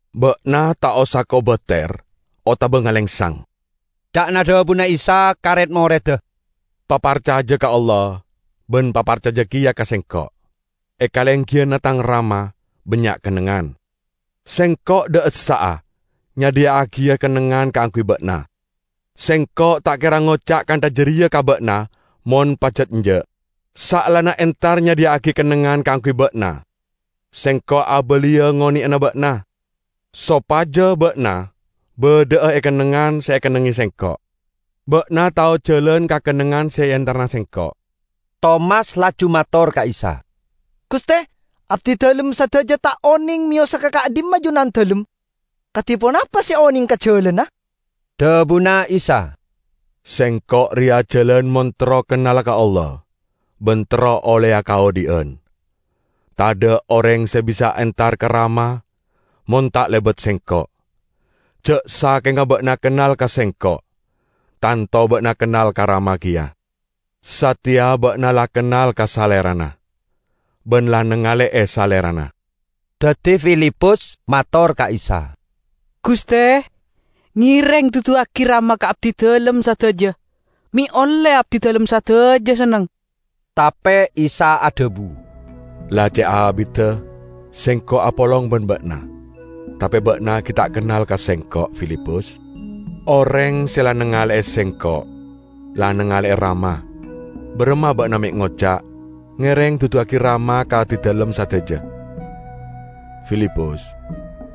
"Ba'na ta' osa kobater otaba ngalengsang," ca'na dhabuna Isa ka red-moredda. "Paparcaja ka Allah, ban paparcaja keya ka Sengko'. E kalenggiyanna Tang Rama bannya' kennengngan. Sengko' dha' essa'a nyadhiya'agiya kennengngan kaangguy ba'na. Sengko' ta' kera ngoca' kantha jareya ka ba'na mon pajat enja'. Saellana entar nyadhiya'agi kennengngan kaangguy ba'na, Sengko' abaliya ngoneyana ba'na, sopaja ba'na badha'a e kennengngan se ekennengnge Sengko'. Ba'na tao jalan ka kennengngan se eentarana Sengko'." Tomas laju mator ka Isa, "Guste, abdidalem sadaja ta' oneng meyosa ka ka'dhimma Junandalem; kadi ponapa se onenga ka jalanna?" Dhabuna Isa, "Sengko' reya jalan mon terro kennala ka Allah ban terro olleya kaodhi'an. Tadha' oreng se bisa entar ka Rama mon ta' lebat Sengko'. Ja' sakenga ba'na kennal ka Sengko', tanto ba'na kennal ka Rama keya. Sateya ba'na la kennal ka Salerana, ban la nangale'e Salerana." Daddi Filipus mator ka Isa, "Guste, ngereng duduwagi Rama ka abdidalem sadaja, me' olle abdidalem sadaja senneng." Tape Isa adhabu, "La ce' abidda Sengko' apolong ban ba'na, tape ba'na gi' ta' kennal ka Sengko', Filipus? Oreng se la nangale'e Sengko', la nangale'e Rama. Baramma ba'na me' ngoca', 'Ngereng duduwagi Rama ka abdidalem sadaja?' Filipus!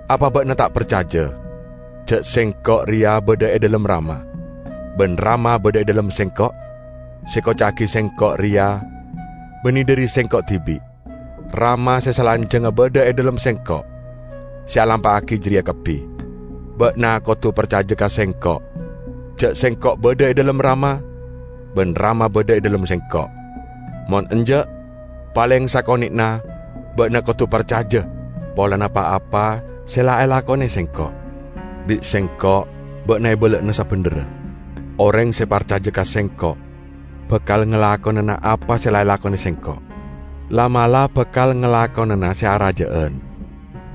Apa ba'na ta' parcaja, ja' Sengko' reya badha e dhalem Rama, ban Rama badha e dhalem Sengko'? Se ekoca'agi Sengko' reya banne dhari Sengko' dibi'. Rama se salanjangnga badha e dhalem Sengko' se alampa'agi jareya kabbi. Ba'na kodu parcaja ka Sengko' ja' Sengko' badha e dhalem Rama ban Rama badha e dhalem Sengko'. Mon enja', paleng sakone'na ba'na kodu parcaja polana pa-apa se la elakone Sengko'. Bi' Sengko' ba'na ebala'ana sabendherra: Oreng se parcaja ka Sengko' bakal ngalakonana apa se la elakone Sengko', la'-mala' bakal ngalakonana se araja'an,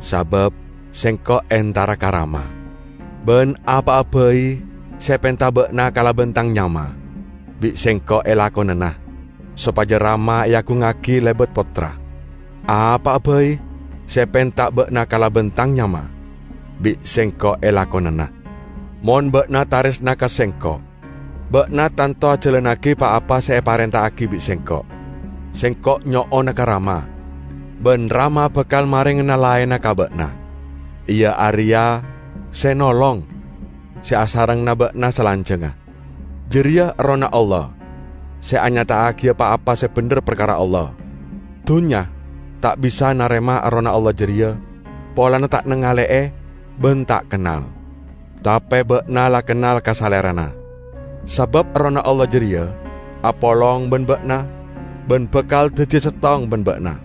sabab Sengko' entara ka Rama. Ban apa'a bai se epenta ba'na kalaban Tang nyama, bi' Sengko' elakonana, sopaja Rama eagungngagi lebat Pottra. Apa'a bai se epenta ba'na kalaban Tang nyama, bi' Sengko' elakonana." "Mon ba'na taresna ka Sengko', ba'na tanto ajalannagi pa-apa se eparenta'agi bi' Sengko'. Sengko' nyo'ona ka Rama, ban Rama bakal marengana laenna ka ba'na, iya areya Se Nolong, se asarengngana ba'na salanjangnga. Jareya Errohna Allah se anyata'agiya pa-apa se bendher parkara Allah. Dunnya ta' bisa narema Errohna Allah jareya polana ta' nangale'e ban ta' kennal. Tape ba'na la kennal ka Salerana, sabab Errohna Allah jareya apolong ban ba'na ban bakal daddiya settong ban ba'na.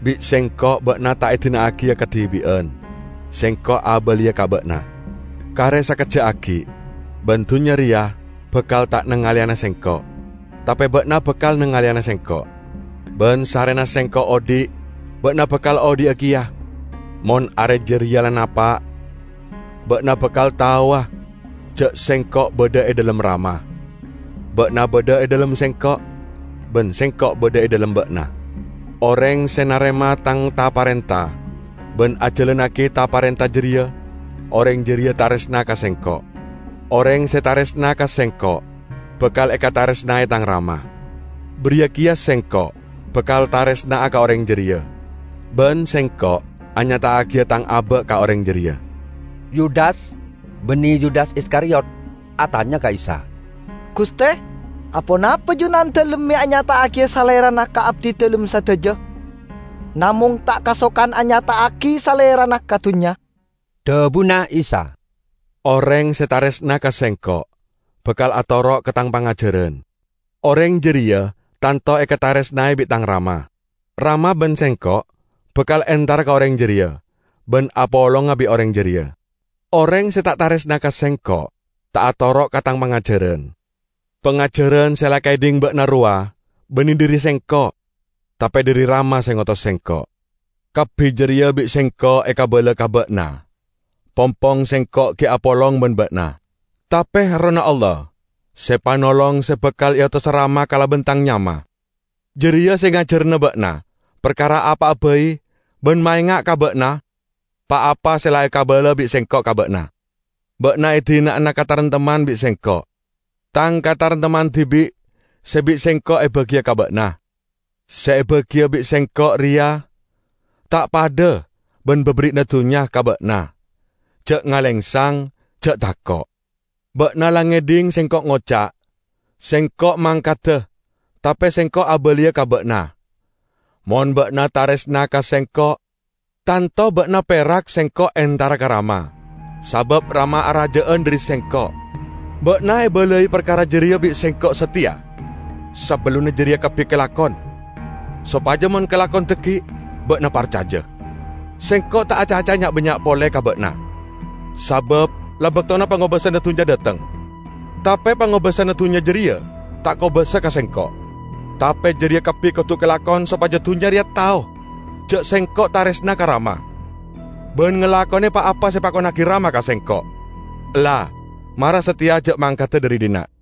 Bi' Sengko' ba'na ta' edina'agiya kadibi'an. Sengko' abaliya ka ba'na. Kare sakejja' aggi', ban dunnya reya bakal ta' nangaleyana Sengko'. Tape ba'na bakal nangaleyana Sengko'. Ban sarrena Sengko' odhi', ba'na bakal odhi'a keya. Mon are jareya la napa', ba'na bakal taowa ja' Sengko' badha e dhalem Rama, ba'na badha e dhalem Sengko' ban Sengko' badha e dhalem ba'na. Oreng se narema Tang ta-parenta ban ajalannagi ta-parenta jareya, oreng jareya taresna ka Sengko'. Oreng se taresna ka Sengko' bakal ekataresnae Tang Rama. Bariya keya Sengko' bakal taresna'a ka oreng jareya, ban Sengko' anyata'agiya Tang aba' ka oreng jareya." Yudas (banne Yudas Iskariyot) atanya ka Isa, "Guste, aponapa Junandalem me' anyata'agiya Salerana ka abdidalem sadaja, namong ta' kasokan anyata'agi Salerana ka dunnya?" Dhabuna Isa, "Oreng se taresna ka Sengko', bakal atoro' ka Tang pangajaran. Oreng jareya tanto ekataresnae bi' Tang Rama. Rama ban Sengko' bakal entara ka oreng jareya ban apolonga bi' oreng jareya. Oreng se ta' taresna ka Sengko' ta' atoro' ka Tang pangajaran. Pangajaran se la ekaedhing ba'na rowa banne dhari Sengko', tape dhari Rama se ngotos Sengko'. Kabbi jareya bi' Sengko' ekabala ka ba'na pongpong Sengko' gi' apolong ban ba'na. Tape Errohna Allah, Se Panolong se bakal eotosa Rama kalaban Tang nyama, jareya se ngajarana ba'na parkara apa'a bai ban maenga' ka ba'na pa-apa se la ekabala bi' Sengko' ka ba'na. Ba'na edina'ana kataremtemman bi' Sengko'. Tang kataremtemman dibi' se bi' Sengko' ebagiya ka ba'na. Se ebagiya bi' Sengko' reya ta' padha ban baberri'na dunnya ka ba'na. Ja' ngalengsang, ja' tako'. Ba'na la ngedhing Sengko' ngoca', 'Sengko' mangkada, tape Sengko' abaliya ka ba'na.' Mon ba'na taresna ka Sengko', tanto ba'na perak Sengko' entara ka Rama, sabab Rama araja'an dhari Sengko'. Ba'na ebalai parkara jareya bi' Sengko' sateya, sabellunna jareya kabbi kalakon, sopaja mon kalakon dhaggi', ba'na parcaja. Sengko' ta' acaca'a nya'-bannya' pole ka ba'na, sabab la baktona pangobasana dunnya dhateng. Tape pangobasana dunnya jareya ta' kobasa ka Sengko'. Tape jareya kabbi kodu kalakon sopaja dunnya reya tao ja' Sengko' taresna ka Rama ban ngalakone pa-apa se epakonnagi Rama ka Sengko'. Ella, mara sateya ja' mangkada dhari dhinna'."